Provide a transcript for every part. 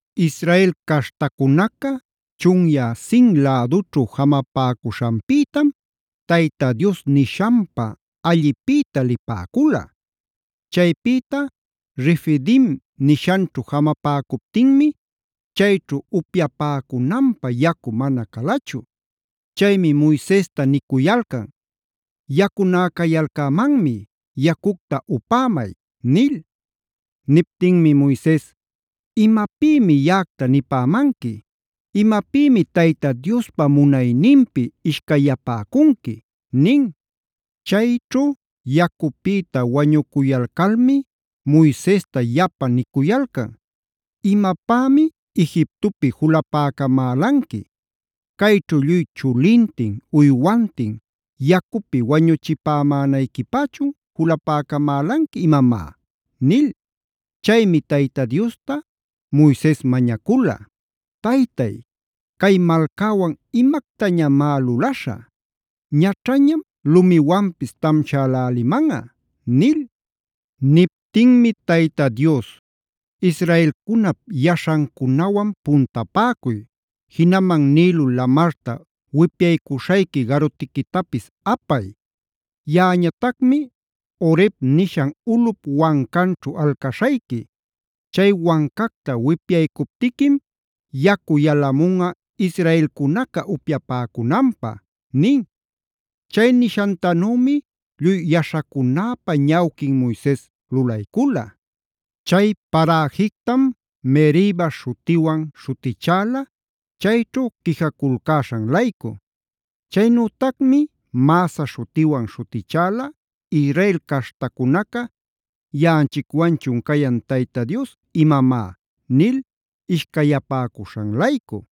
Israel caśhtacunaca chunyä Sin lädućhu jamapäcuśhanpïtam Tayta Dios nishanpa allipïta lipäcula. Chaypïta Refidim nishanćhu jamapäcuptinmi chayćhu upyapäcunanpä yacu mana calachu. Chaymi Moisesta nicuyalcan: “Yacunäcayalcämanmi yacucta upämay” nil. Niptinmi Moises: “¿Imapïmi yaꞌacta nipämanqui? ¿Imapïmi Tayta Diospa munayninpi ishcayapäcunqui?” nin. Chayćhu yacupïta wañucuyalcalmi Moisesta yapa nicuyalcan: “¿Imapämi Egiptopi julapäcamälanqui? ¿Cayćhu lluy chulintin, uywantin yacupi wañuchipämänayquipächun julapäcamälanqui imamá?” nil. Chaymi Tayta Diosta Moises mañacula: “¿¡Taytay, cay malcäwan imactañamá lulaśhä!? Ñaćhañam lumiwanpis tamśhälälimanꞌa” nil. Niptinmi Tayta Dios: “Israelcunap yaśhancunawan puntapäcuy, jinaman Nilo lamarta wipyaycuśhayqui garutiquitapis apay. Yaꞌañatacmi Horeb nishan ulꞌup wancanćhu alcaśhayqui. Chay wancacta wipyaycuptiquim yacu yalamunꞌa israelcunaca upyapäcunanpä” nin. Chay nishantanümi lluy yaśhacunäpa ñawquin Moises lulaycula. Chay paräjictam Meriba śhutiwana śhutichäla, chayćhu quijaculcäśhan-laycu. Chaynütacmi Masah śhutiwanb śhutichäla Israel caśhtacunaca: “¿¡Yaꞌanchicwanchun cayan Tayta Dios imamá!?” nil ishcayapäcuśhan-laycu.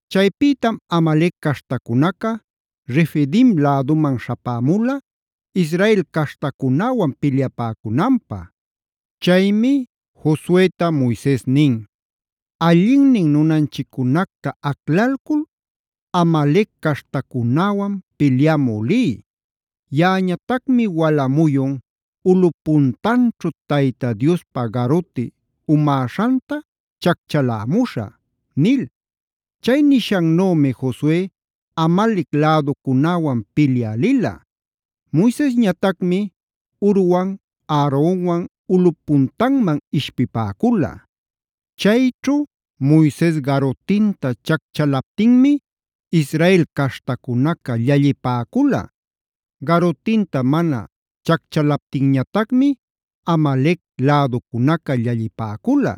Chaypïtam Amalec caśhtacunaca Refidim läduman śhapämula Israel caśhtacunäwan pilyapäcunanpä. Chaymi Josueta Moises nin: “Allinnin nunanchiccunacta aclalcul Amalec caśhtacunäwan pilyamü liy. Yaꞌañatacmi wala muyun ulꞌup puntanćhu Tayta Diospa garuti umäśhanta chacchalämüśhä” nil. Chay nishannümi Josue Amalec läducunäwan pilyä lila. Moisesñatacmi Hurwan Aaronwan ulꞌup puntanman ishpipäcula. Chayćhu Moises garutinta chacchalaptinmi Israel caśhtacunaca llallipäcula; garutinta mana chacchalaptinñatacmi Amalec läducunaca llallipäcula.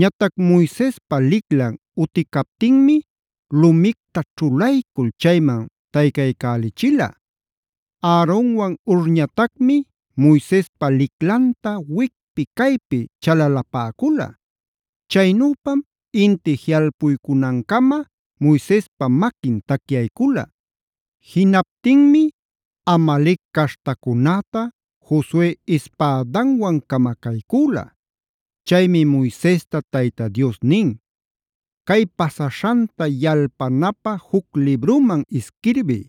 Ñatac Moisespa liclan uticaptinmi lumicta ćhulaycul chayman taycaycälichila. Aaronwan Hurñatacmi Moisespa liclanta wicpi caypi chalalapäcula. Chaynüpam inti jiꞌalpuycunancama Moisespa maquin tacyaycula. Jinaptinmi Amalec caśhtacunäta Josue ispädanwan camacaycüla. Chaymi Moisesta Tayta Dios nin: “Cay pasaśhanta yalpanapä juc libruman isquirbiy.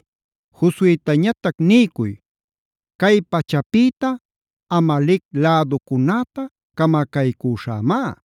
Josuetañatac niycuy: ‘Cay pachäpïta Amalec läducunäta camacaycüśhämá;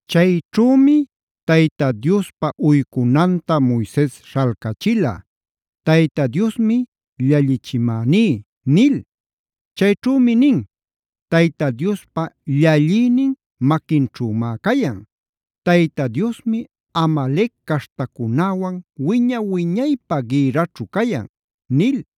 Chayćhümi Tayta Diospa uycunanta Moises śhalcachila “Tayta Diosmi llallichimäní”d nil. Chayćhümi nin: Tayta Diospa llallïnin maquinćhümá cayan. Tayta Diosmi Amalec caśhtacunäwan wiña-wiñaypä gïrraćhu cayan” nil.